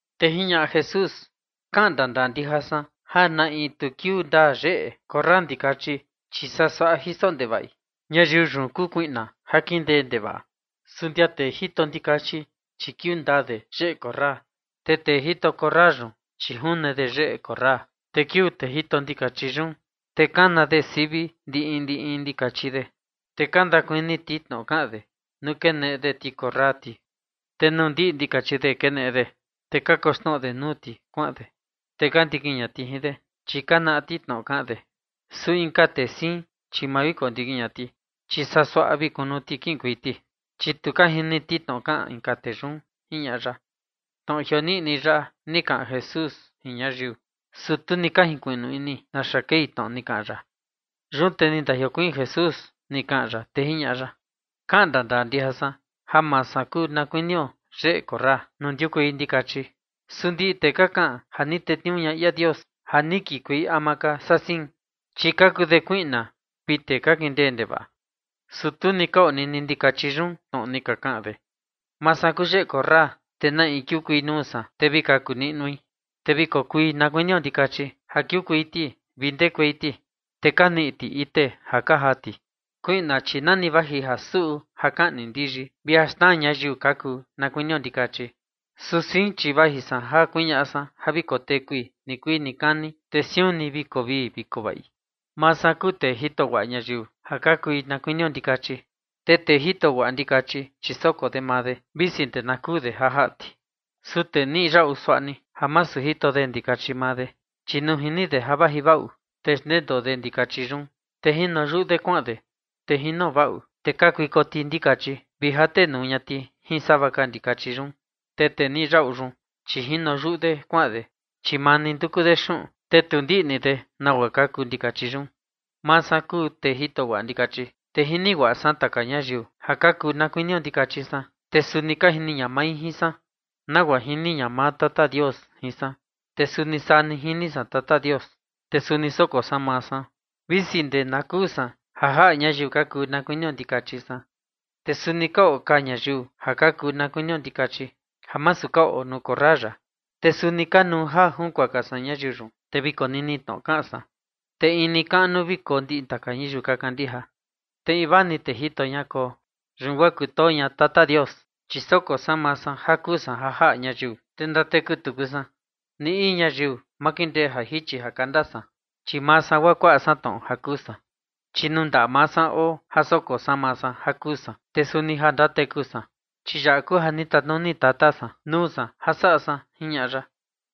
Te jiñaꞌa Jesús: ―Kaꞌan ndandaa ndija san, ja na in tu kiuu ndaa yeꞌe korra ndikachi, chi saa suaꞌa jiso ndevaꞌi, ñayiu yun kuu kuiꞌna ja kindee ndevaꞌa. Su ndia tee jito ndikachi, chi kiuu ndaa de yeꞌe korra. Te tee jito korra yun, chi june de yeꞌe korra, te kiuu tee jito ndikachi yun, te kana sivi de ndi in ndi in ndikachi de. Te ka ndakuni ti tnoꞌo kaꞌan de nuu keneꞌe de ti korra ti. Te nuu ndiꞌi ndikachi de keneꞌe de, te kakoxnoꞌo de nuu ti kuaꞌan de, te ka ndikin ña ti jin de, chi ka naꞌa ti tnoꞌo kaꞌan de. Su inka tee siin, chi ma vi kondikin ña ti, chi saa suaꞌa vi kunu ti kiꞌinkuei ti, chi tu ka jini ti tnoꞌo kaꞌan inka tee yun ―jiñaꞌa ya. Tnoꞌo jioniꞌni yaꞌa ni kaꞌan Jesús jin ñayiu, su tu ni ka junkuiꞌnu ini naxa kei tnoꞌo ni kaꞌan ya. Yun te ni ndajiokuiin Jesús ni kaꞌan ya, te jiñaꞌa ya: ―Kaꞌan ndandaa ndija san, ja maa san kuu na kuinio yeꞌe korra nuu ndiukuei ndikachi. Su ndiꞌi tee ka kaꞌan ja ni tetniuu ña ia Dios ja ni kikuei ama ka saa sein, chi ka kuu de kuiꞌna vi tee ka kindee ndevaꞌa, su tu ni ka onini ndikachi yun tnoꞌo ni ka kaꞌan de. Maa san kuu yeꞌe korra, te na in kiukuei nuu san, te vi kaku niꞌnui. Te vi kokui na kuinio ndikachi ja kiukuei ti vi ndekuei ti, te ka niꞌi ti ite ja ka jaa ti. Kuiꞌna, chi nani vaji ja suꞌu, ja kaꞌni ndiyi vi ja xnaa ñayiu ka kuu na kuinio ndikachi. Su sein, chi vaji san ja kuñaꞌa san ja vi kotekui nikuii nikani, te siun ni vi koo vii vi koo vaꞌi. Maa san kuu tee jito guaꞌa ñayiu ja ka kui na kuinio ndikachi, te tee jito guaꞌa ndikachi, chi soko de maa de, visi ndee na kuu de ja jaꞌa ti. Su tee niꞌi yaꞌu suaꞌa ni, ja masu jito de ndikachi maa de, chi nuu jini de ja vaji vaꞌu, te xndendoo de ndikachi yun, te jino yuꞌu de kuaꞌan de. Te jino vaꞌu, te kakuiko ti ndikachi vi jate nuu ña ti jin sava ka ndikachi yun. Te tee niꞌi yaꞌu yun, chi jino yuꞌu de kuaꞌan de, chi maa ni nduku de xuꞌun, te tu ndiꞌni de nagua ka kuu ndikachi yun. ’Maa san kuu tee jito guaꞌa ndikachi, te jini guaꞌa san taka ñayiu ja ka kuu na kuinio ndikachi san, te suni ka jini ña mai jin san. Nagua jini ña maa Tata Dios jin san, te suni saa ni jini san Tata Dios, te suni soko san maa san, visi ndee na kuu san ja jaꞌa ñayiu ka kuu na kuinio ndikachi san. Te suni ka oo ka ñayiu ja ka kuu na kuinio ndikachi ja masu ka oo nuu korra yaꞌa. Te suni kanuu ja junkuaka san ñayiu yun, te vi konini tnoꞌo kaꞌan san, te in ni kaꞌnu vi koo ndiꞌi ñayiu ka kandija, te invaa ni tee jito ña koo. Yun guaa kutoo ña Tata Dios, chi soko san maa san ja kuu san ja jaꞌa ñayiu, te ndateku tuku san. Ni in ñayiu ma kindee ja jichi ja kanda san, chi maa san guaa kuaꞌa san tnoꞌo ja kuu san, chi nuu ndaꞌa maa san oo ja soko san maa san ja kuu san, te suni ja ndateku san. Chi yaꞌa kuu ja ni tatnuni Tata san nuu san ja saꞌa san ―jiñaꞌa ya.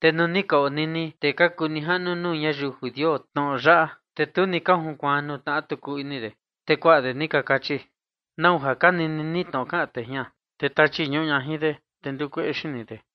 Te nuu ni ka onini tee ka kuu nijaꞌnu nuu ñayiu judio tnoꞌo yaꞌa, te tu ni ka junkuaan nuu tnaꞌa tuku ini de. Te kuaꞌa de ni ka kachi: ―¿Nau ja ka nini ni tnoꞌo kaꞌan tee jian? Te tachi ñuꞌu ña jin de, te ndukueꞌe xini de.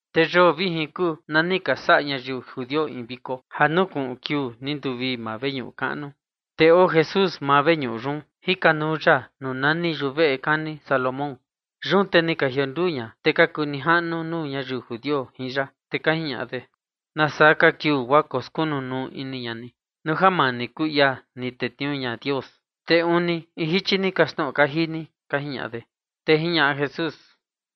Te yoo vijin kuu na ni ka saꞌa ñayiu judio in viko ja nukuꞌun kiuu nduvii maa veñuꞌu kaꞌnu. Te oo Jesús maa veñuꞌu yun jikanuu ya nuu nani yuveꞌe kani Salomón. Yun te ni ka jionduu ña tee ka kuu nijaꞌnu nuu ñayiu judio jin ya, te ka jiñaꞌa de: ―¿Nasaa ka kiuu guaa koskunu nuu ini ña ni? Nuu ja maa ni kuu ia ni tetniuu ña Dios, te uni in jichi ni kaxtnoꞌo kaji ni ―ka jiñaꞌa de. Te jiñaꞌa Jesús: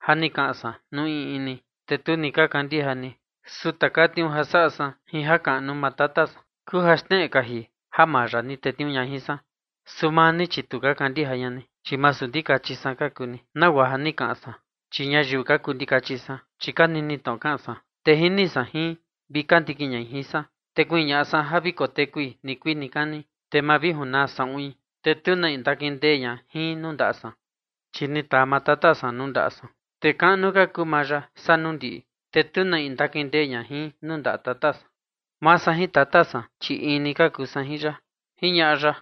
―Ja ni kaꞌan san nuu in in ni, te tu ni ka kandija ni. Su taka tniuu ja saꞌa san jin jakaꞌnu maa Tata san kuu ja xneꞌe kaji ja maa ya ni tetniuu ña jin san. Su maa ni, chi tu ka kandija ña ni, chi masu ndikachi san ka kuu ni, nagua ja ni kaꞌan san. Chi ñayiu ka kuu ndikachi san, chi ka nini tnoꞌo kaꞌan san, te jini san jin, vi ka ndikin ñai jin san. Te kuñaꞌa san ja vi kotekui nikuii nikani, te ma vi junaa saꞌuin, te tu na in ndakindee ña jin nuu ndaꞌa san. Chi ni taa maa Tata san nuu ndaꞌa san, te kaꞌnu ka kuu maa ya saa nuu ndiꞌi, te tu na in ndakindee ña jin nuu ndaꞌa Tata san. Maa san jin Tata san, chi in ni ka kuu san ―jiñaꞌa ya.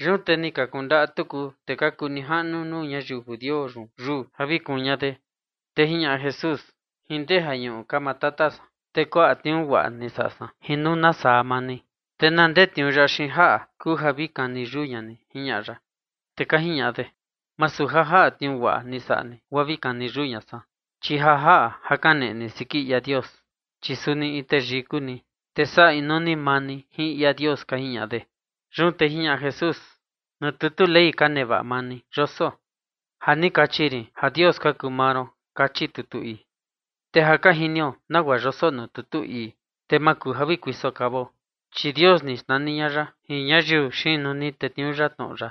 Yun te ni ka kundaꞌa tuku tee ka kuu nijaꞌnu nuu ñayiu judio yun yuu ja vi kuun ña de. Te jiñaꞌa Jesús: ―Jin ndee jañuꞌu ka maa Tata san, te kuaꞌa tniuu guaꞌa ni saꞌa san jin nuu nasaa maa ni, ¿te na ndee tniuu yaꞌa xiin jaꞌa kuu ja vi kani yuu ña ni? ―jiñaꞌa ya. Te ka jiñaꞌa de: ―Masu ja jaꞌa tniuu guaꞌa ni saꞌa ni guaa vi kani yuu ña san, chi ja jaꞌa ja kaneꞌe ni siki ia Dios, chi suni in teyii kuu ni, te saꞌa inuu ni maa ni jin ia Dios ―ka jiñaꞌa de. Yun te jiñaꞌa Jesús: ―Nuu tutu Ley ka nevaꞌa maa ni yoso: “Ja ni kachi rin ja dios ka kuu maa ron”, kachi tutu ii. Te ja ka jinio nagua yoso nuu tutu ii, te ma kuu ja vi kuiso kavao, chi “dios” ni xnani ña ya jin ñayiu xiin nuu ni tetniuu ya tnoꞌo ya.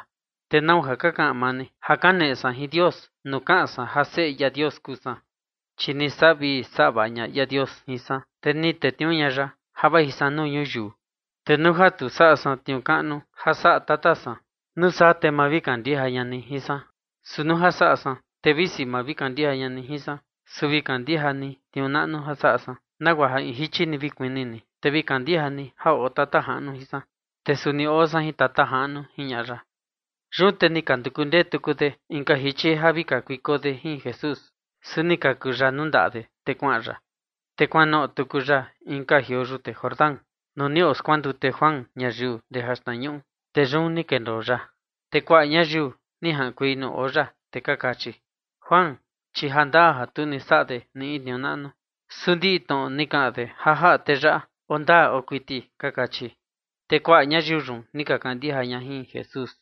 ¿Te nau ja ka kaꞌan maa ni ja kaneꞌe san jin Dios nuu kaꞌan san ja Seꞌe ia Dios kuu san? Chi ni saꞌa vii saꞌa vaꞌa ña ia Dios jin san, te ni tetniuu ña ya ja vaji san nuu ñuyiu. Te nuu ja tu saꞌa san tniuu kaꞌnu ja saꞌa Tata san, nuu saa te ma vi kandija ña ni jin san. Su nuu ja saꞌa san, te visi ma vi kandija ña ni jin san, su vi kandija ni tniuu naꞌnu ja saꞌa san, nagua ja in jichi ni vi kuni ni, te vi kandija ni ja oo Tata Jaꞌnu jin san, te suni oo san jin Tata Jaꞌnu ―jiñaꞌa ya. Yun te ni ka nduku ndee tuku de inka jichi ja vi kakuiko de Jesús, su ni kaku ya nuu ndaꞌa de kuaꞌan ya. Te kuanoꞌo tuku ya inka jioo yute Jordán, nuu ni oskuandute Juan ñayiu ndee jaxtnañuꞌu, te yun ni kendoo ya. Te kuaꞌa ñayiu ni jaꞌankuei nuu oo ya, te ka kachi: ―Juan, chi jandaa ja tu ni saꞌa de ni in tniuu naꞌnu, su ndiꞌi tnoꞌo ni kaꞌan de ja jaꞌa tee yaꞌa oo ndaa kuiti ―ka kachi. Te kuaꞌa ñayiu yun ni ka kandija ña jin Jesús.